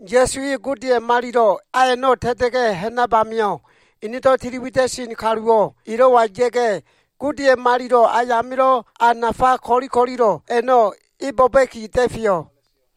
Ya꞉su e Godeya꞉ malilo꞉ a a꞉no꞉ ta꞉ta꞉ga꞉ ha꞉nab amio꞉, enedo꞉ tili wida꞉sen kaluwo꞉ elo꞉wa ya꞉ga꞉, Godeya꞉ malilo꞉ ayamilo꞉ a nafale ko꞉li ko꞉lilo꞉ a꞉no꞉ e bo꞉ba꞉ki da꞉feyo꞉.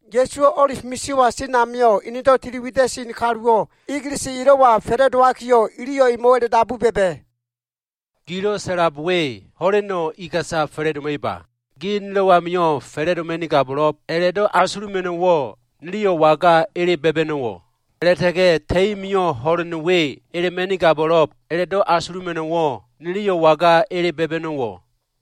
Ya꞉suwo꞉ O꞉lif misio꞉wa sen amio꞉, enedo꞉ tili wida꞉sen kaluwo꞉ egelese elo꞉wa fa꞉la꞉dowakiyo꞉, iliyo꞉ emo꞉wo꞉ a꞉la꞉dabu ba꞉ba꞉, “Gilo꞉ sa꞉lab we ho꞉leno꞉ iga꞉sa fa꞉la꞉doma꞉iba? Ge nilo꞉ amio꞉ fa꞉la꞉doma꞉nigabo꞉lo꞉b a꞉la꞉do꞉ asuluma꞉no꞉wo꞉, niliyo꞉ waga ele ba꞉ba꞉no꞉wo꞉? A꞉la꞉ta꞉ga꞉ ta꞉i mio꞉ ho꞉len we elema꞉nigabo꞉lo꞉b a꞉la꞉do꞉ asuluma꞉no꞉wo꞉, niliyo꞉ waga ele ba꞉ba꞉no꞉wo꞉?”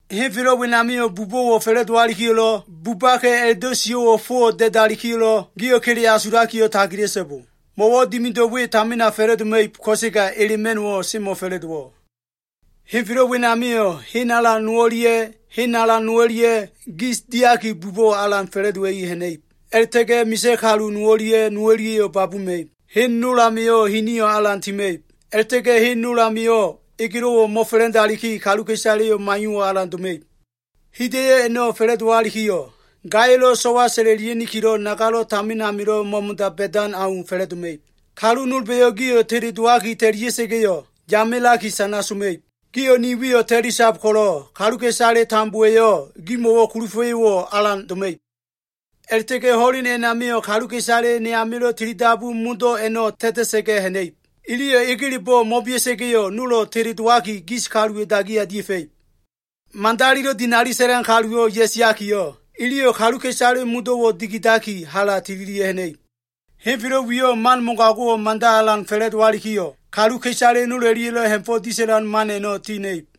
Henfelo꞉ wenamio꞉ bubo꞉wo꞉ fa꞉la꞉dowalikiyo꞉lo꞉, bubaka꞉ a꞉la꞉do꞉ sio꞉wo꞉ fowo꞉ da꞉dalikiyo꞉lo꞉, gio꞉ kele asulakiyo꞉ tagila꞉so꞉bo. Mo꞉wo꞉ dimido꞉ we tamina fa꞉la꞉doma꞉ib, ko꞉sega elema꞉no꞉wo꞉ semo꞉fa꞉la꞉dowo꞉. Henfelo꞉ wenamio꞉ hen alan no o꞉lia꞉ hen alan no o꞉lia꞉yo꞉ gis diaki bubo꞉wo꞉ alan fa꞉la꞉dowa꞉i ha꞉na꞉ib. A꞉la꞉ta꞉ga꞉ misa꞉ kalu no o꞉lia꞉ no o꞉lia꞉yo꞉ babuma꞉ib. Hen nol amio꞉ hiniyo꞉ alan tima꞉ib a꞉la꞉ta꞉ga꞉ hen nol amio꞉ egelo꞉wo꞉ mo꞉fa꞉la꞉ndaliki, kaluka꞉isaleyo꞉ maiyo꞉wo꞉ alan doma꞉ib. Hida꞉yo꞉ a꞉no꞉ fa꞉la꞉dowalikiyo꞉, gaya꞉lo꞉ so꞉wa sa꞉la꞉lia꞉nikilo꞉ nagalo꞉ tamin amilo꞉ mo꞉mo꞉da ba꞉dan au fa꞉la꞉doma꞉ib. “Kalu nolba꞉yo꞉ gio꞉ teledowaki ta꞉lia꞉sa꞉ga꞉yo꞉, yamelaki sana soma꞉ib. Gio꞉ ni wiyo꞉ ta꞉lisab ko꞉lo꞉ kaluka꞉isale tambowa꞉yo꞉ gimo꞉wo꞉ kulufa꞉yo꞉wo꞉ alan doma꞉ib. A꞉la꞉ta꞉ga꞉ ho꞉len a꞉namio꞉ kaluka꞉isale ne amilo꞉ tilidabu a꞉no꞉ modo꞉wo꞉ ta꞉ta꞉sa꞉ga꞉ ha꞉na꞉ib. Iliyo꞉ egelebo꞉ mo꞉bea꞉sa꞉ga꞉yo꞉, nolo꞉ teledowaki gis kaluwa꞉ dagiya dia꞉fa꞉ib. Madalilo꞉ dinali sa꞉lan kaluwo꞉ ya꞉siakiyo꞉, iliyo꞉ kaluka꞉isale modo꞉wo꞉ dikidaki, hala tililia꞉ ha꞉na꞉ib. Henfelo꞉ wiyo꞉ man mogago꞉wo꞉ mada alan fa꞉la꞉dowalikiyo꞉, kaluka꞉isale nol o꞉lia꞉lo꞉ ha꞉fo꞉ disa꞉lan man a꞉no꞉ ti ha꞉na꞉ib.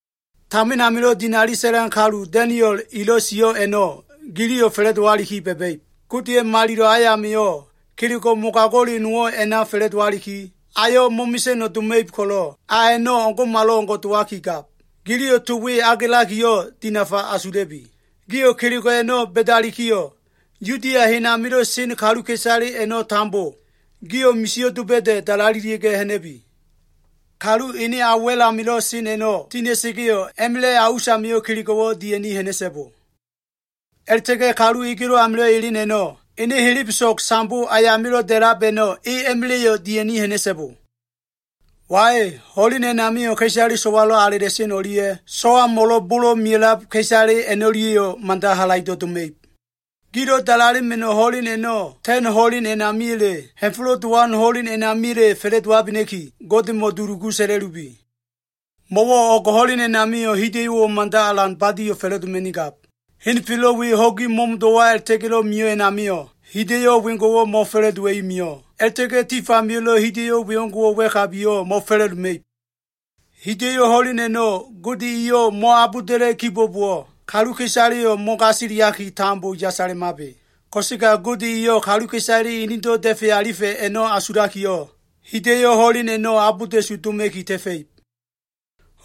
“Tamin amilo꞉ dinali sa꞉lan kalu Da꞉niol elo꞉ sio꞉ a꞉no꞉ giliyo꞉ fa꞉la꞉dowaliki ba꞉ba꞉ib. Godeya꞉ malilo꞉ ayamio꞉, kelego꞉ mogago꞉le nowo꞉ a꞉na fa꞉la꞉dowaliki, ayo꞉ mo꞉mesa꞉no꞉ doma꞉ib ko꞉lo꞉, a a꞉no꞉ o꞉ngo꞉malo꞉ngo꞉ dowaki gab. Giliyo꞉ to we agelakiyo꞉, dinafa asula꞉bi. Gio꞉ kelego꞉ a꞉no꞉ ba꞉dalikiyo꞉, Yudia hen amilo꞉ sen kaluka꞉isale a꞉no꞉ tambo, gio꞉ misio꞉ doba꞉da꞉ dalalelia꞉ga꞉ ha꞉na꞉bi. Kalu ene a wa꞉l amilo꞉ sen a꞉no꞉ tina꞉sa꞉ga꞉yo꞉, a꞉ma꞉la꞉ a usamio꞉ kelego꞉wo꞉ dia꞉ni ha꞉na꞉so꞉bo. A꞉la꞉ta꞉ga꞉ kalu egelo꞉ amilo꞉ elen a꞉no꞉, ene helebeso꞉g sambo ayamilo꞉ da꞉lab a꞉no꞉ e a꞉ma꞉la꞉yo꞉ dia꞉ni ha꞉na꞉so꞉bo. Wai, ho꞉len a꞉namio꞉ ka꞉isale so꞉walo꞉ alela꞉sen o꞉lia꞉ so꞉wamo꞉lo꞉ bolo꞉ mea꞉lab ka꞉isale a꞉no꞉lia꞉yo꞉ mada halaido꞉ doma꞉ib. Gilo꞉ dalalema꞉no꞉ ho꞉len a꞉no꞉, ta꞉n ho꞉len a꞉namiya꞉le, Ha꞉fo꞉lo꞉ Dowan ho꞉len a꞉namiya꞉le fa꞉la꞉dowabena꞉ki, Godemo꞉ dulugu sa꞉la꞉lubi. Mo꞉wo꞉ o꞉g ho꞉len a꞉namio꞉ hida꞉yo꞉wo꞉ mada alan badio꞉ fa꞉la꞉doma꞉nigab. Henfelo꞉ we ho꞉gi mo꞉mo꞉do꞉wa a꞉la꞉ta꞉ga꞉lo꞉ mio꞉ a꞉namio꞉, hida꞉yo꞉ wengo꞉wo꞉ mo꞉fa꞉la꞉dowa꞉i mio꞉. A꞉la꞉ta꞉ga꞉ tifamio꞉lo꞉ hida꞉yo꞉ wengo꞉wo꞉ wa꞉kabiyo꞉ mo꞉fa꞉la꞉doma꞉ib. Hida꞉yo꞉ ho꞉len a꞉no꞉ Gode eyo꞉ mo꞉abolda꞉la꞉ kibo꞉bowo꞉, kaluka꞉isaleyo꞉ mo꞉gasiliaki, tambo yasalemabe. Ko꞉sega Gode eyo꞉ kaluka꞉isale enedo꞉ da꞉fe alifa꞉ a꞉no꞉ asulakiyo꞉, hida꞉yo꞉ ho꞉len a꞉no꞉ abolda꞉su doma꞉ki ta꞉fa꞉ib.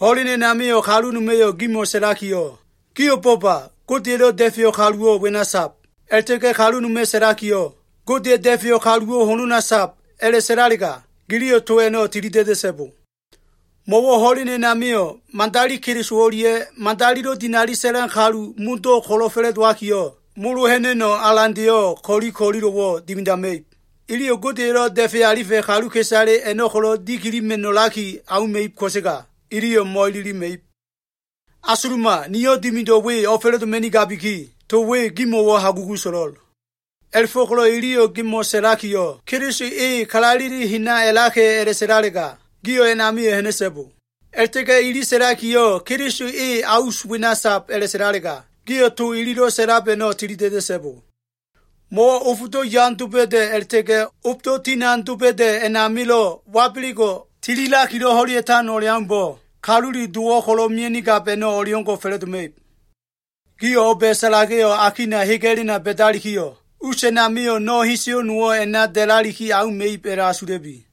Ho꞉len a꞉namio꞉ kalu noma꞉yo꞉ gimo꞉ sa꞉lakiyo꞉, ‘Gio꞉ bo꞉ba! Godeya꞉lo꞉ da꞉feyo꞉ kaluwo꞉ wena sab’ a꞉la꞉ta꞉ga꞉ kalu noma꞉ sa꞉lakiyo꞉, ‘Godeya꞉lo꞉ da꞉feyo꞉ kaluwo꞉ honona sab’ a꞉la꞉sa꞉lalega, giliyo꞉ to a꞉no꞉ tilida꞉da꞉so꞉bo. Mo꞉wo꞉ ho꞉len a꞉namio꞉, madali Keliso o꞉lia꞉ madalilo꞉ dinali sa꞉lan kaluwo꞉ modo꞉ ko꞉lo꞉ fa꞉la꞉dowakiyo꞉, molo ha꞉na꞉no꞉ alandeyo꞉ ko꞉li ko꞉lilo꞉wo꞉ dimidama꞉ib. Iliyo꞉ Godeya꞉lo꞉ da꞉fe alifa꞉ kaluka꞉isale a꞉no꞉ ko꞉lo꞉ dikilima꞉no꞉laki auma꞉ib ko꞉sega iliyo꞉ mo꞉ililima꞉ib. Asuluma! Niyo꞉ dimido꞉ we o꞉fa꞉la꞉doma꞉nigabiki, to we gimo꞉wo꞉ hagugu so꞉lo꞉l. A꞉la꞉fo꞉ko꞉lo꞉ iliyo꞉ gimo꞉ sa꞉lakiyo꞉, ‘Keliso e kalaleli hena a꞉laka꞉’ a꞉la꞉sa꞉lalega, gio꞉ a꞉namio꞉ ha꞉na꞉so꞉bo. A꞉la꞉ta꞉ga꞉ ili sa꞉lakiyo꞉, ‘Keliso e a us wena sab,’ a꞉la꞉sa꞉lalega, gio꞉ to ililo꞉ sa꞉lab a꞉no꞉ tilida꞉da꞉so꞉bo. Mo꞉wo꞉ ofdo꞉ yan doba꞉da꞉ a꞉la꞉ta꞉ga꞉ ofdo꞉ tinan doba꞉da꞉ a꞉namilo꞉ wabelego꞉ tililakilo꞉ ho꞉lea꞉tan o꞉leaumbo꞉, Kalule Dowo꞉ ko꞉lo꞉ mia꞉nigab a꞉no꞉ o꞉leo꞉ngo꞉ fa꞉la꞉doma꞉ib. Giyo꞉ o꞉ba꞉ salageyo꞉ akina hega꞉lena ba꞉dalikiyo꞉, us a꞉namio꞉ no꞉ heseyo꞉ nowo꞉ a꞉na da꞉laliki auma꞉ib a꞉la꞉asula꞉bi.”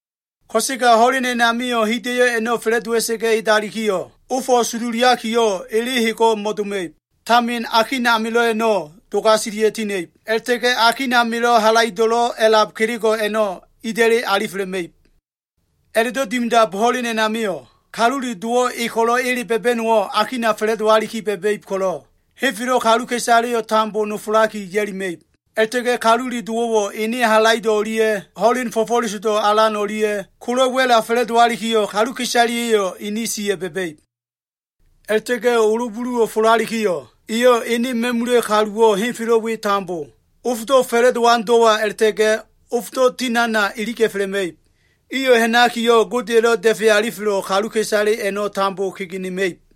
“Ko꞉sega ho꞉len a꞉namio꞉, hida꞉yo꞉ a꞉no꞉ fa꞉la꞉dowa꞉sa꞉ga꞉ edalikiyo꞉, “ ‘Ofo꞉ sololiakiyo꞉, ele hego꞉ mo꞉doma꞉ib. Tamin akin amilo꞉ a꞉no꞉ dogaselia꞉ tina꞉ib, a꞉la꞉ta꞉ga꞉ Akin amilo꞉ halaido꞉lo꞉ a꞉lab kelego꞉ a꞉no꞉ ida꞉li alifelema꞉ib.’ A꞉la꞉do꞉ dimidab ho꞉len a꞉namio꞉, Kalule Dowo꞉ e ko꞉lo꞉ ele ba꞉ba꞉no꞉wo꞉ akina fa꞉la꞉dowaliki ba꞉ba꞉ib ko꞉lo꞉, henfelo꞉ kaluka꞉isaleyo꞉ tambo nofolaki ya꞉lima꞉ib. A꞉la꞉ta꞉ga꞉ Kalule Dowo꞉wo꞉ ene halaido꞉ o꞉lia꞉ ho꞉len fo꞉fo꞉lesodo꞉ alan o꞉lia꞉ kola꞉ wa꞉la fa꞉la꞉dowalikiyo꞉, kaluka꞉isaleya꞉yo꞉ ini siya꞉ ba꞉ba꞉ib. A꞉la꞉ta꞉ga꞉ olo buluwo꞉ folalikiyo꞉, eyo꞉ ene ma꞉mula꞉ kaluwo꞉ henfelo꞉ we tambo, ofdo꞉ fa꞉la꞉dowan do꞉wa a꞉la꞉ta꞉ga꞉ ofdo꞉ tinana iliga꞉felema꞉ib. Iyo꞉ ha꞉nakiyo꞉, Godeya꞉lo꞉ da꞉fe alifelo꞉ kaluka꞉isale a꞉no꞉ tambo kegenema꞉ib.”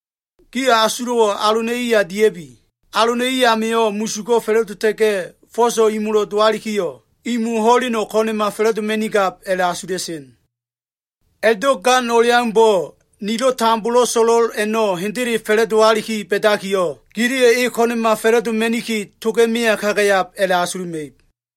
“Gio꞉ asulo꞉wo꞉ alona꞉ iya dia꞉bi. Alona꞉ i amio꞉ musugo꞉ fa꞉la꞉dota꞉ga꞉ fo꞉so꞉ imolo꞉ dowalikiyo꞉, imo ho꞉leno꞉ ko꞉na꞉ma fa꞉la꞉doma꞉nigab a꞉la꞉asula꞉sen. A꞉la꞉do꞉ gan o꞉leaumbo꞉, nilo꞉ tambolo꞉ so꞉lo꞉l a꞉no꞉ hendele fa꞉la꞉dowaliki ba꞉dakiyo꞉, giliyo꞉ e ko꞉na꞉ma fa꞉la꞉doma꞉niki, toga꞉ meya kagayab a꞉la꞉asuluma꞉ib.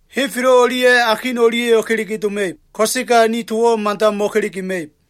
Henfelo꞉ o꞉lia꞉ akin o꞉lia꞉yo꞉ kelege doma꞉ib, ko꞉sega ni towo꞉ mada mo꞉kelegema꞉ib.”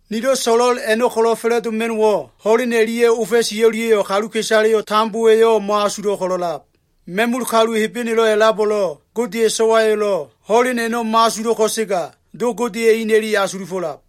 “Nilo꞉ so꞉lo꞉l a꞉no꞉ ko꞉lo꞉ fa꞉la꞉doma꞉no꞉wo꞉, ho꞉len o꞉lia꞉ ofa꞉si o꞉lia꞉yo꞉ kaluka꞉isaleyo꞉ tambowa꞉yo꞉ mo꞉asulo꞉ ko꞉lo꞉lab. Ma꞉mula꞉ kalu Hebenelo꞉ a꞉labo꞉lo꞉, Godeya꞉ So꞉wayo꞉lo꞉ ho꞉len a꞉no꞉ mo꞉asulo꞉ ko꞉sega, Do Godeya꞉ ina꞉li asulufo꞉lab.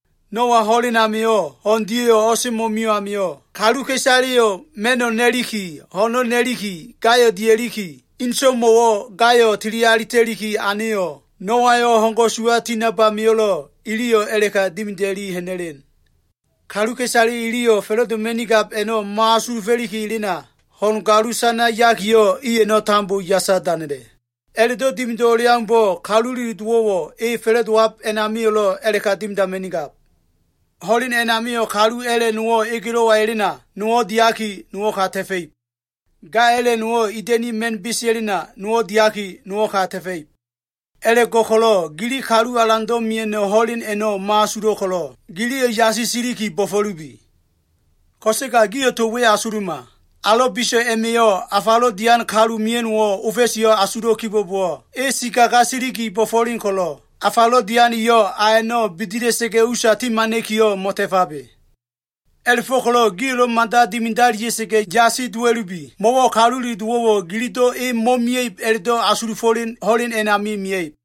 Noa ho꞉len amio꞉ ho꞉n dia꞉yo꞉ o꞉semo꞉ mio꞉ amio꞉, kaluka꞉isaleyo꞉ ma꞉no꞉ na꞉liki, ho꞉no꞉ na꞉liki, gayo꞉ dia꞉liki, inso꞉mo꞉wo꞉ gayo꞉ tili alita꞉liki aneyo꞉, Noayo꞉ ho꞉n ko꞉suwa tinab amio꞉lo꞉, iliyo꞉ a꞉la꞉ka dimida꞉li ha꞉na꞉len. Kaluka꞉isale iliyo꞉ fa꞉la꞉doma꞉nigab a꞉no꞉ mo꞉asulufo꞉liki elena, ho꞉n galusana yakiyo꞉, i a꞉no꞉ tambo yasa danela꞉. A꞉la꞉do꞉ dimido꞉ o꞉leaumbo꞉, Kalule Dowo꞉ elo꞉ fa꞉la꞉dowab a꞉namio꞉lo꞉ a꞉la꞉ka dimidama꞉nigab. Ho꞉len a꞉namio꞉, kalu a꞉la꞉ nowo꞉ egelo꞉wa elena, nowo꞉ diaki, nowo꞉ ka ta꞉fa꞉ib. Ga a꞉la꞉ nowo꞉ ida꞉ni ma꞉n besea꞉lena, nowo꞉ diaki, nowo꞉ ka ta꞉fa꞉ib. “A꞉la꞉fo꞉ko꞉lo꞉ gili Kalu Alando꞉ mia꞉no꞉ ho꞉len a꞉no꞉ mo꞉asulo꞉ ko꞉lo꞉, giliyo꞉ yasi siliki bo꞉fo꞉lubi. Ko꞉sega gio꞉ to we asuluma. Alo꞉ biso꞉ a꞉ma꞉yo꞉ afalo꞉ dian kalu mia꞉no꞉wo꞉ ofa꞉siyo꞉ asulo꞉ kibo꞉bowo꞉, e sikaga siliki bo꞉fo꞉len ko꞉lo꞉, afalo꞉ dian eyo꞉ a a꞉no꞉ bidila꞉sa꞉ga꞉ usa timana꞉kiyo꞉ mo꞉ta꞉fabe. A꞉la꞉fo꞉ko꞉lo꞉ gio꞉lo꞉ mada dimidalia꞉sa꞉ga꞉ yasi dowa꞉lubi. Mo꞉wo꞉ Kalule Dowo꞉wo꞉ gilido꞉ e mo꞉mia꞉ib a꞉la꞉do꞉ asulufo꞉len ho꞉len a꞉nami mia꞉ib.”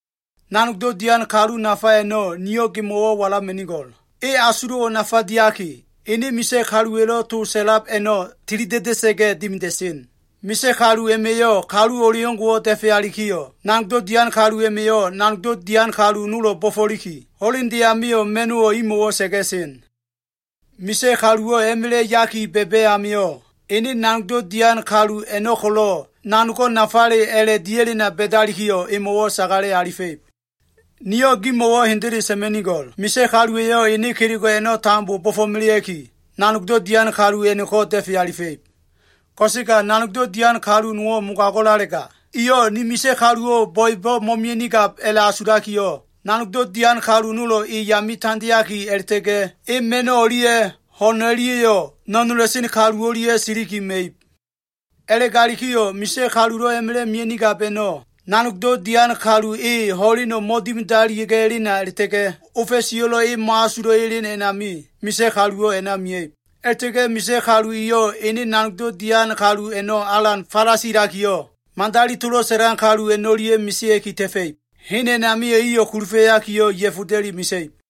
“Nanogdo꞉ dian kalu nafa a꞉no꞉ niyo꞉ gimo꞉ walama꞉nigo꞉l. E asulo꞉wo꞉ nafa diaki, ene misa꞉ kaluwa꞉lo꞉ to sa꞉lab a꞉no꞉ tilida꞉da꞉sa꞉ga꞉ dimida꞉sen. Misa꞉ kalu a꞉ma꞉yo꞉ kalu o꞉leo꞉ngo꞉wo꞉ da꞉fealikiyo꞉, nanogdo꞉ dian kalu a꞉ma꞉yo꞉ nanogdo꞉ dian kalu nolo꞉ bo꞉fo꞉liki, ho꞉lende amio꞉ ma꞉no꞉wo꞉ imo꞉wo꞉ sa꞉ga꞉sen. Misa꞉ kaluwo꞉ a꞉ma꞉la꞉ yaki ba꞉ba꞉ amio꞉, ene nanogdo꞉ dian kalu a꞉no꞉ ko꞉lo꞉ nanogo꞉ nafale a꞉la꞉ dia꞉lena ba꞉dalikiyo꞉ emo꞉wo꞉ sagale alifa꞉ib. Niyo꞉ gimo꞉wo꞉ hendele sa꞉ma꞉nigo꞉l. Misa꞉ kalu eyo꞉ ene kelego꞉ a꞉no꞉ tambo bo꞉fo꞉melea꞉ki, nanogdo꞉ dian kalu a꞉no꞉ko꞉ da꞉fe alifa꞉ib. Ko꞉sega nanogdo꞉ dian kalu nowo꞉ mogago꞉lalega, eyo꞉ ‘Ni misa꞉ kaluwo꞉ bo꞉ebo꞉ mo꞉mia꞉nigab’ a꞉la꞉asulakiyo꞉, nanogdo꞉ dian kalu nolo꞉ e yame tandeaki a꞉la꞉ta꞉ga꞉ e ma꞉no꞉ o꞉lia꞉ ho꞉n o꞉lia꞉yo꞉ no꞉nola꞉sen kalu o꞉lia꞉ siliki ma꞉ib. A꞉la꞉galikiyo꞉ misa꞉ kalulo꞉ a꞉ma꞉la꞉ mia꞉nigab a꞉no꞉, nanogdo꞉ dian kalu e ho꞉leno꞉ mo꞉dimidalia꞉ga꞉ elena a꞉la꞉ta꞉ga꞉ ofa꞉siyo꞉lo꞉ e mo꞉asulo꞉ elen a꞉nami, misa꞉ kaluwo꞉ a꞉na mia꞉ib. A꞉la꞉ta꞉ga꞉ misa꞉ kalu eyo꞉ ene nanogdo꞉ dian kalu a꞉no꞉ alan falasilakiyo꞉, madali tolo꞉ sa꞉lan kalu a꞉no꞉lia꞉ mesea꞉ki ta꞉fa꞉ib. Hen a꞉namio꞉ iyo꞉ kulufa꞉yakiyo꞉, ya꞉foda꞉li mesa꞉ib.”